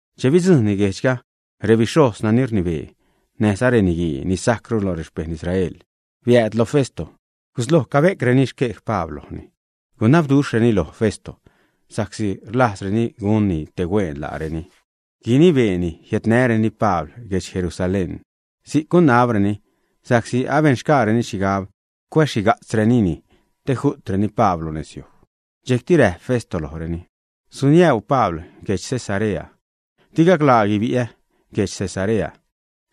Che bidzujṉni guejdxga, rebixhojz nani rnibee näjza reniguii ni sajcru lo rexpejṉ Israel biääd lo Festo. Gusloj cabe'creni xquej Pabl lojni. Gunabduxhreni lo Festo sa'csi rlajzreni gunni te huen laareni, guinibeeni jiädnäreni Pabl guedx Jerusalén. Si'c gunabreni, sa'csi abenxgaareni xhigab cuäzxhiga'tzreni te ju'treni Pabl lo nezyuj. Dxejcti räjp Festo lojreni: ―Suniäu Pabl guedx Cesarea. Di gaclaa guibi'ä guedx Cesarea.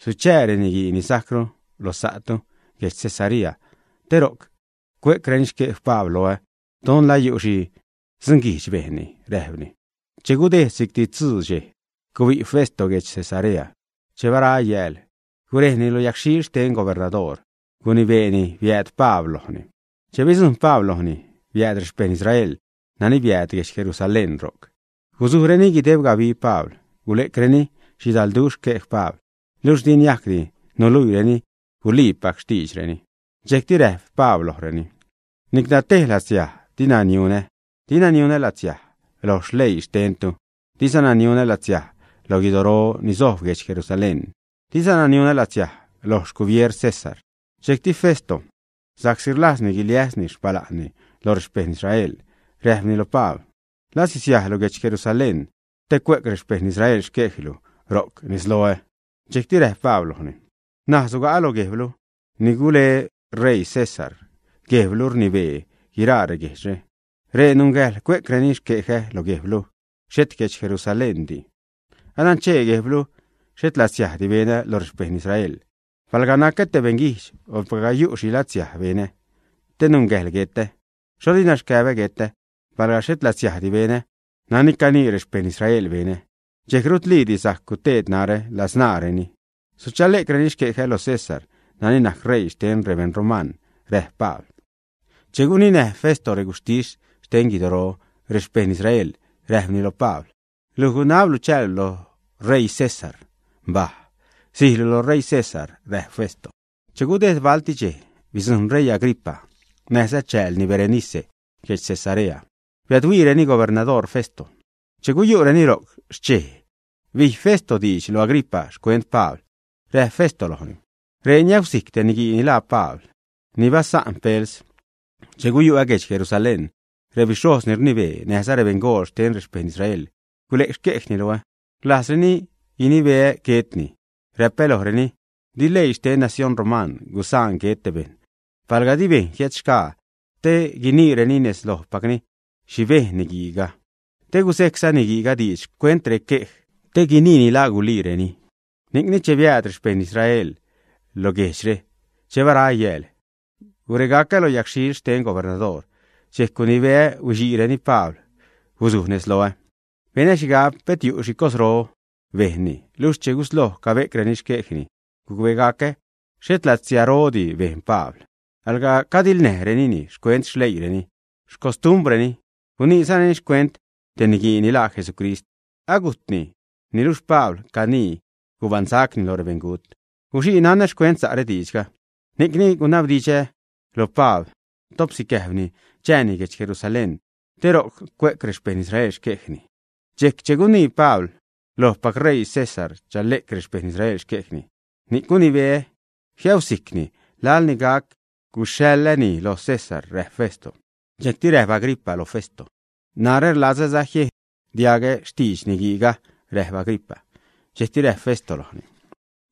Suchää reniguii ni sajcru lo sa'tu guedx Cesarea, te ro'c cue'creni xquej Pabl loä, don la yu' xhi dzunguijdx bejnni ―räjpni. Che gudejd si'cti tzuu dxej, gubi' Festo guedx Cesarea. Che bara yääl, gurejni lo yagxhil xten gubernadoor, gunibeeni biääd Pabl lojni. Che bidzujṉ Pabl lojni, biääd rexpejṉ Israel nani biääd guedx Jerusalén ro'c. Guzujreni guideb gabi Pabl. Gule'creni xhidalduxh xquej Pabl, luxh di niajcdi nuluiireni guliipac xtiidxreni. Dxejcti räjp Pabl lojreni: ―Nicla tej latsiaj dina niunä, dina niunä latsiaj loj leii xtennu, dizana niunä latsiaj lo guidoro ni sojb guedx Jerusalén, dizana niunä latsiaj loj xgubier César. Dxejcti Festo, sa'csi rlajzni guiliäsni xpala'nni loj rexpejṉ Israel, räjpni lo Pabl: ―¿La sisiajlu guedx Jerusalén te cue'c rexpejṉ Israel xquejlu ro'c nezloä, ä? Dxejcti räjp Pabl lojni: ―N̲aj suga'a loj guejblu, ni gule ṟeii César. Guejblu rnibee guiraa reguejdxre. Ree nungäjḻ cue'creni xquejä lo guejblu, xhet guedx Jerusaléndi. Ananchee guejblu xhet latsiajdi benä lo rexpejṉ Israel. Palga nacä te beṉguijdx, o palga yu' xhi latsiaj benä te nungäjḻ guetä, xho dina xcäbä guetä. Palga xhet latsiajdi benä nani canii rexpejṉ Israel benä, dxejc rutliidi sajc guteed narä ladzṉaareni. Suchale'creni xquejä lo César nani najc ṟeii xten rebeṉ roman ―räjp Pabl. Che guninäj Festo reguxhtis xten xquidoro rexpejṉ Israel, räjpni lo Pabl: ―Luj gunablu chäälu loj ṟeii César. Mbaj. Sijlu lo ṟeii César ―räjp Festo. Che gudejd balti dxej, bidzujṉ ṟeii Agripa näjza chäälni Berenice guedx Cesarea. Biädhuiireni gubernadoor Festo. Che guyu'reni ro'c xchej, bij Festo diidx lo Agripa xcuent Pabl. Räjp Festo lojni: ―Ree niäusijc te niguii ni laa Pabl ni basa'n Pels. Che guyu'ä guedx Jerusalén, rebixhojz ni rnibee näjza rebeṉgool xten rexpejṉ Israel gule'c xquejni loä. Rlajzreni guinibeä guetni. Räpä lojreni: “Di leii xten nacióṉ roman gusaan guet te bejṉ palga di bejṉ jiädxgaa te guiniireni nez lojpacni xhi bejn niguiiga, te guzejcza niguiiga diidx xcuent requej, te guiniini la guliireni.” Ni'cni che biääd rexpejṉ Israelga lo guejdxre, che bara yääl guregacä lo yagxhil xten gubernadoor. Dxejc gunibeä huixiireni Pabl guzuj nez loä. Benä xhigab pet yu' xhi cosro bejnni. Luxh che gusloj cabe'creni xquejni, gucbegacä xhet latsiarodi bejn Pabl. Alga cadiḻnäjrenini xcuent xleiireni, xcostumbrreni. Guniizareni xcuent te niguii ni laa Jesucrist. Agujtni, niluxh canii Pabl gubaṉsacni lo rebeṉgut. Guxii nanä xcuent sa' diidxre, ni'cni gunabdidxä lo Pabl top sicäjbni chanää́ni guedx Jerusalén te ro'c cue'c rexpejṉ Israel xquejni. Dxejc che gunii Pabl lojpac ṟeii César chale'c rexpejṉ Israel xquejni, ni'c gunibeä jiäusijcni laḻ ni gac guxhaḻäni lo César ―räjp Festo. Dxejcti räjp Agripa lo Festo: ―Narä rlazäza jiejn diagä xtidx niguiiga ―räjp Agripa. Dxejcti räjp Festo lojni: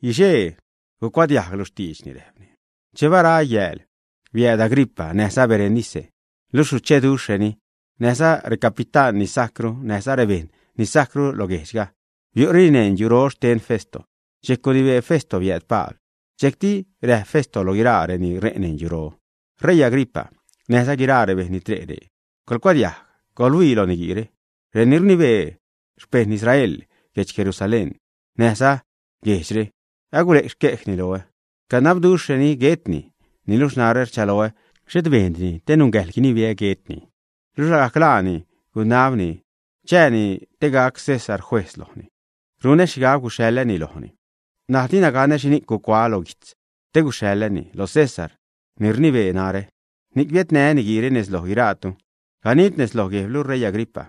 ―Guixee gucuadiajglu xtiidxni ―räjpni. Che bara yääl, biääd Agripa näjza Berenice, luxh sucheduxhreni. Näjza recapitán ni sajcru näjza rebejṉ ni sajcru lo guejdxga biu'reni neṉ yuro xten Festo. Dxejc gunibee Festo biääd Pabl. Dxejcti räjp Festo lo guiraa reni ṟe' neṉ yuro: ―R̲eii Agripa näjza guiraa rebejṉ ni tre' ree, coḻcuadiajg. Coḻhuii lo niguiire. Reni rnibee xpejṉ Israel guedx Jerusalén näjza guejdxre agule'c xquejni loä, canabduxhreni guetni. Niluxh narä rchaloä xhet bejndini te nungäjḻ guinibeä guetni. Luxh lagajc laani gunabni chääni te gac César juejz lojni, ni'c runä xhigab guxhaḻäni lojni. N̲aj dina ganä xhini'c gucuaä lo guijtz te guxhaḻäni lo César ni rnibee narä. Ni'c biädnää́ niguiire nez lo guiraatu, ganid nez loj guejblu, ṟeii Agripa,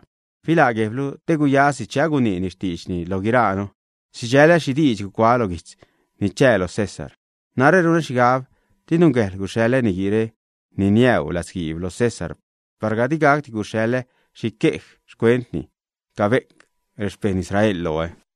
filaa guejblu te gaxäjsi che aguiniini xtiidxni lo guiraanu, sidxälä xhi diidx gucuaä lo guijtz ni chää lo César. Narä runä xhigab di nungäjḻ guxhaḻä niguiire ni niäu latzguiib lo César palga di gacdi gusule'ä xhi quej xcuentni cabe'c rexpejṉ Israel loä.